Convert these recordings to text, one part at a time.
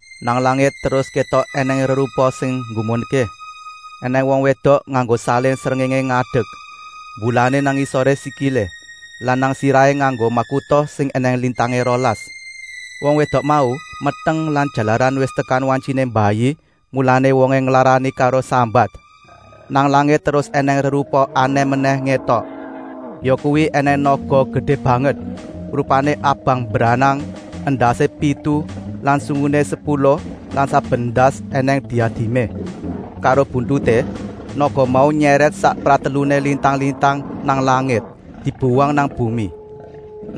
Nang langit terus kétok ènèng rerupa sing nggumunké. Enèng wong wédok nganggo salin srengéngé ngadek, mbulané nang ngisoré sikilé lan nang sirahé nganggo makuta sing ènèng lintangé rolas. Wong wédok mau meteng lan jalaran wis tekan wantyiné mbayi, mulané wongé nglarani karo sambat. Nang langit terus ènèng rerupa anèh menèh ngétok, yakuwi ènèng naga gedé banget, rupané abang mbranang, endasé pitu lan sunguné sepuluh lan saben endas ènèng diadimé. Karo buntuté, naga mau nyèrèt sak prateluné lintang-lintang nang langit, dibuwang nang bumi.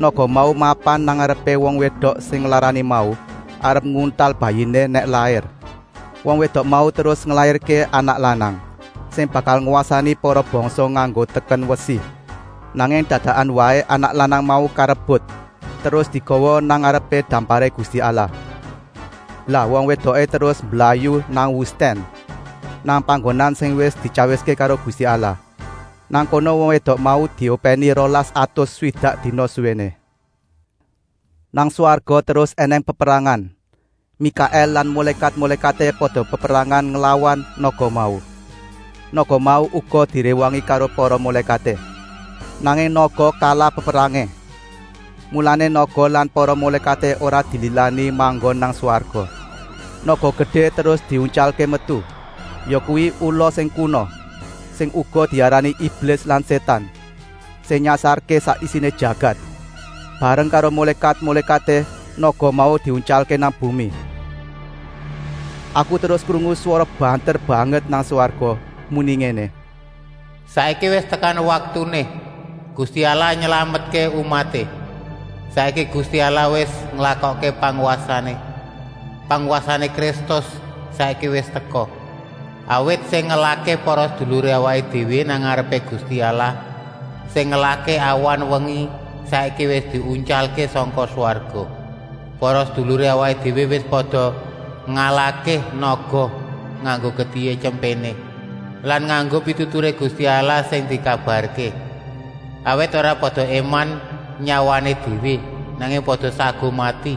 Naga mau mapan nang ngarepé wong wédok sing nglarani mau, arep nguntal bayiné nèk lair. Wong wédok mau terus nglairké anak lanang, sing bakal ngwasani para bangsa nganggo teken wesi. Nanging dadakan waé anak lanang mau karebut, terus digawa nang ngarepé damparé Gusti Allah. Lah wong wédoké terus mblayu nang wustèn, nang panggonan sing wis dityawiské karo Gusti Allah. Nang kono wong wédok mau diopèni rolas atus swidak dina suwéné. Nang swarga terus ènèng peperangan. Mikaèl lan mulékat-mulékaté pada peperangan nglawan naga mau. Naga mau uga diréwangi karo para mulékaté. Nanging naga kalah peperangé. Mulané naga lan para mulékaté ora dililani manggon nang swarga. Naga gedé terus diuntyalké metu, yakuwi ula sing kuna, sing uga diarani Iblis lan Sétan, sing nyasarké sak isiné jagat. Bareng karo mulékat-mulékaté naga mau diuntyalké nang bumi. Aku terus krungu swara banter banget nang swarga, muni ngéné: “Saiki wis tekan waktuné Gusti Allah nylametké umaté. Saiki Gusti Allah wis nglakokké pangwasané. Pangwasané Kristus saiki wis teka. Awit sing ngelahké para seduluré awaké déwé nang ngarepé Gusti Allah, sing ngelahké awan-wengi, saiki wis diuntyalké sangka swarga. Para seduluré awaké déwé wis pada ngalahké naga nganggo getihé Tyempéné lan nganggo pituturé Gusti Allah sing dikabarké. Awit ora pada éman nyawané déwé, nanging pada saguh mati.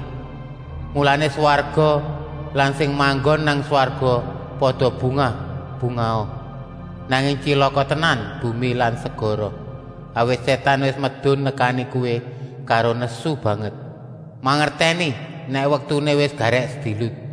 Mulané, swarga lan sing manggon nang swarga pada bungah-bungaha! Nanging tyilaka tenan bumi lan segara. Awit Sétan wis medun nekani kowé karo nesu banget, mangertèni nèk waktuné wis garèk sedilut.”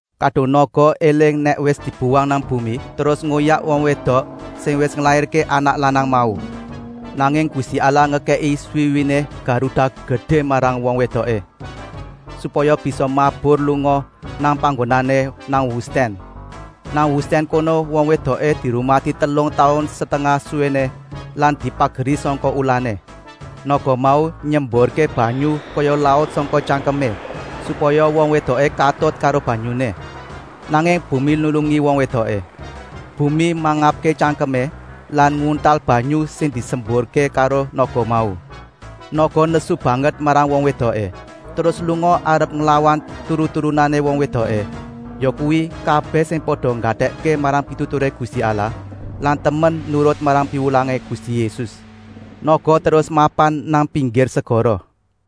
Kadung naga éling nèk wis dibuwang nang bumi, terus ngoyak wong wédok sing wis nglairké anak lanang mau. Nanging Gusti Allah ngekèki swiwiné garuda gedé marang wong wédoké, supaya bisa mabur lunga nang panggonané nang wustèn. Nang wustèn kono wong wédoké dirumati telung taun setengah suwéné lan dipageri sangka ulané. Naga mau nyemburké banyu kaya laut sangka tyangkemé, supaya wong wédoké katut karo banyuné. Nanging bumi nulungi wong wédoké. Bumi mangapké tyangkemé lan nguntal banyu sing disemburké karo naga mau. Naga nesu banget marang wong wédoké, terus lunga arep nglawan turun-turunané wong wédoké, yakuwi kabèh sing pada nggatèkké marang pituturé Gusti Allah lan temen nurut marang piwulangé Gusti Yésus. Naga terus mapan nang pinggir segara.